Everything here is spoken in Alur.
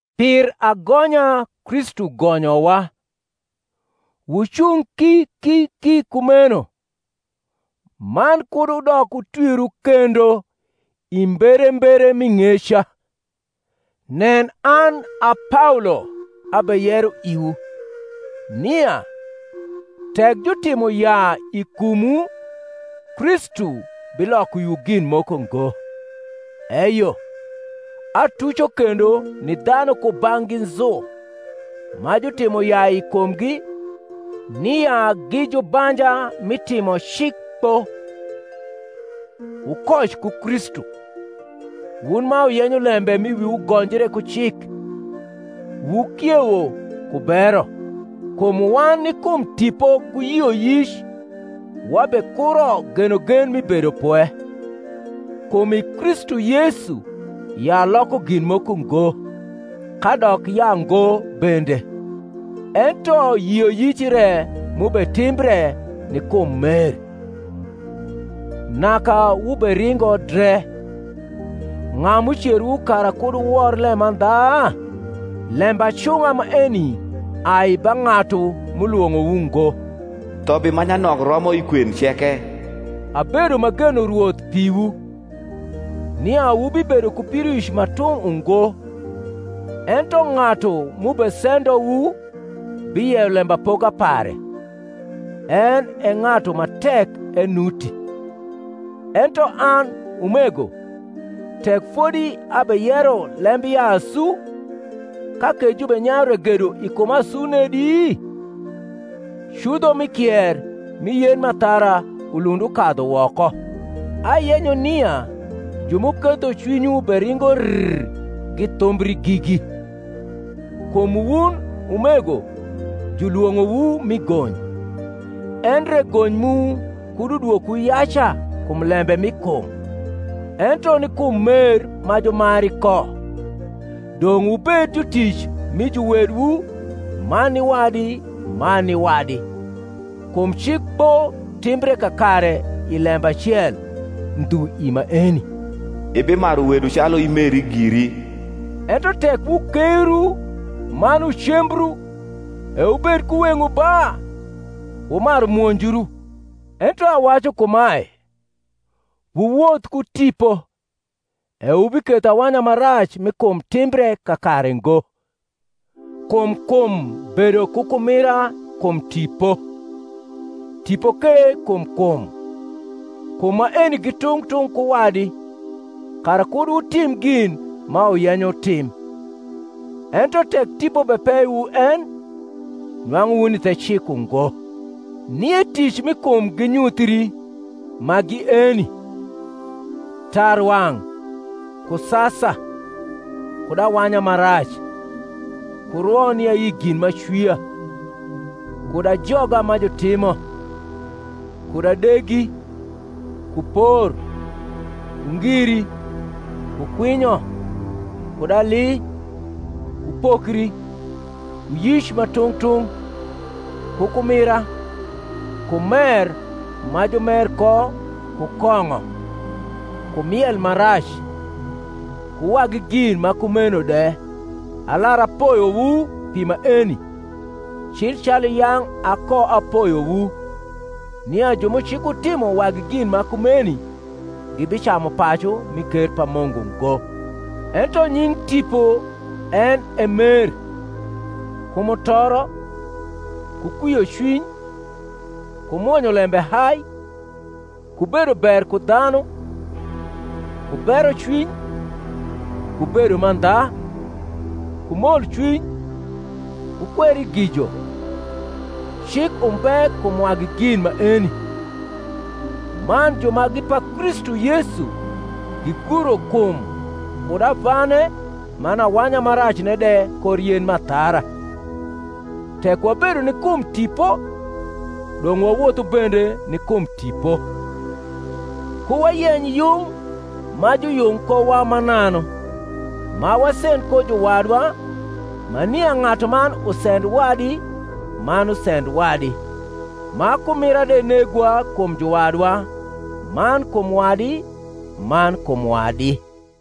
Pir agonya Kristu gonyowa: wucung ki ki ki kumeno, man kud wudok wutwiru kendo i mberembere mi ng’eca. Nen, an a Paolo abeyero iwu, nia, tek jutimo yaa i kumwu Kristu biloko iwu gin moko ngo. Eyo, atuco kendo ni dhanu kubang’gi nzu ma jutimo yaa i kumgi, nia gi jubanja mi timo cik kpo. Wukoc ku Kristu, wun ma wuyenyo lembe m’i wiwu gonjre ku cik; wukiewo ku bero. Kum wan ni kum Tipo ku yioyic wabekuro genogen mi bedopwe. Kum i Kristu Yesu yaa loko gin moko ngo, kadok yaango bende; ento yioyic re m’ubetimbre ni kum mer. Naka wuberingo dre; ug’a m’ucerowu kara kud wuwor lemandha? Lembacung’a maeni ai ba ng’atu m’ulwong’owu ngo. Ihobi ma nyanok romo i kwen ceke. Abedo m’ageno Rwoth piwu, nia wubibedo ku pidoic ma tung’ ungo: ento ng’atu m’ubesendowu biyeyo lembapoka pare, en e ng’atu ma tek enuti. Ento an, umego, tek fodi abeyero lembyaa asu, ka ke jubenyayu ragedo i kuma asu nedi? cudho mi kier mi yen m’athara ulund ukadhu woko. Ayenyo nia ju m’uketho cwinywu beringo rr githumbri gigi. Kum wun, umego, julwong’owu mi gony; endre gony mu kud udwokwu yaca kum lembe mi kum, ento ni kum mer ma jumari ko dong’ wubed jutic mi juwedwu man ni wadi man ni wadi. Kum cik kpo timbre kakare i lembe acel, ndhu i maeni: Ibimaru wedu calu imeri giri. Ento tek wukeiru man wucembru, e wubed ku weng’wu ba wumaru mwonjru. Ento awacu kumae, Wuwoth ku Tipo, e wubiketho awanya ma rac mi kum timbre kakare ngo. Kum kum bedo ku kumira kum Tipo, Tipo ke kum kum; kum maeni gi tung’ tung’ ku wadi; kara kud wutim gin ma wuyenyo wutim. Ento tek Tipo bepeyowu en, nwang’u wuni the cik ungo. Nie tic mi kum ginyuthii, ma gi eni: tarwang’, ku sasa, kud awanya ma rac, ku rwo ni ayi gin m’acwia, kud ajoga ma jutimo, kud adegi, ku por, ku ngiri, ku kwinyo, kud ali, ku pokri, ku yic ma tung’ tung’, ku kumira, ku mer ma jumer ko ku kong’o, ku miel ma rac, ku wagi gin ma kumeno de; alar apoyowu pi maeni, cil calu yang’ akoapoyowu, nia ju m’ucikutimo wagi gin ma kumeni gibicamu pacu mi ker pa Mungu ngo. Ento nying’ Tipo en e mer, ku mutoro, ku kwiocwiny, ku mwonyolembe hai, ku bedo ber ku dhanu, ku berocwiny, ku bedo mandha, ku molcwiny, ku kwerigijo, cik umbe kum wagi gin maeni. Man ju ma gi pa Kristu Yesu giguro kum kud avane man awanya ma racne de kor yen m’athara. Tek wabedo ni kum Tipo, dong’ wawothu bende ni kum Tipo. Ku wayeny yung ma juyung kowa mananu, ma wasend ko juwadwa ma nia ng’atuman usend wadi man usend wadi, ma kumua de negwa kum juwadwa man kum wadi man kum wadi.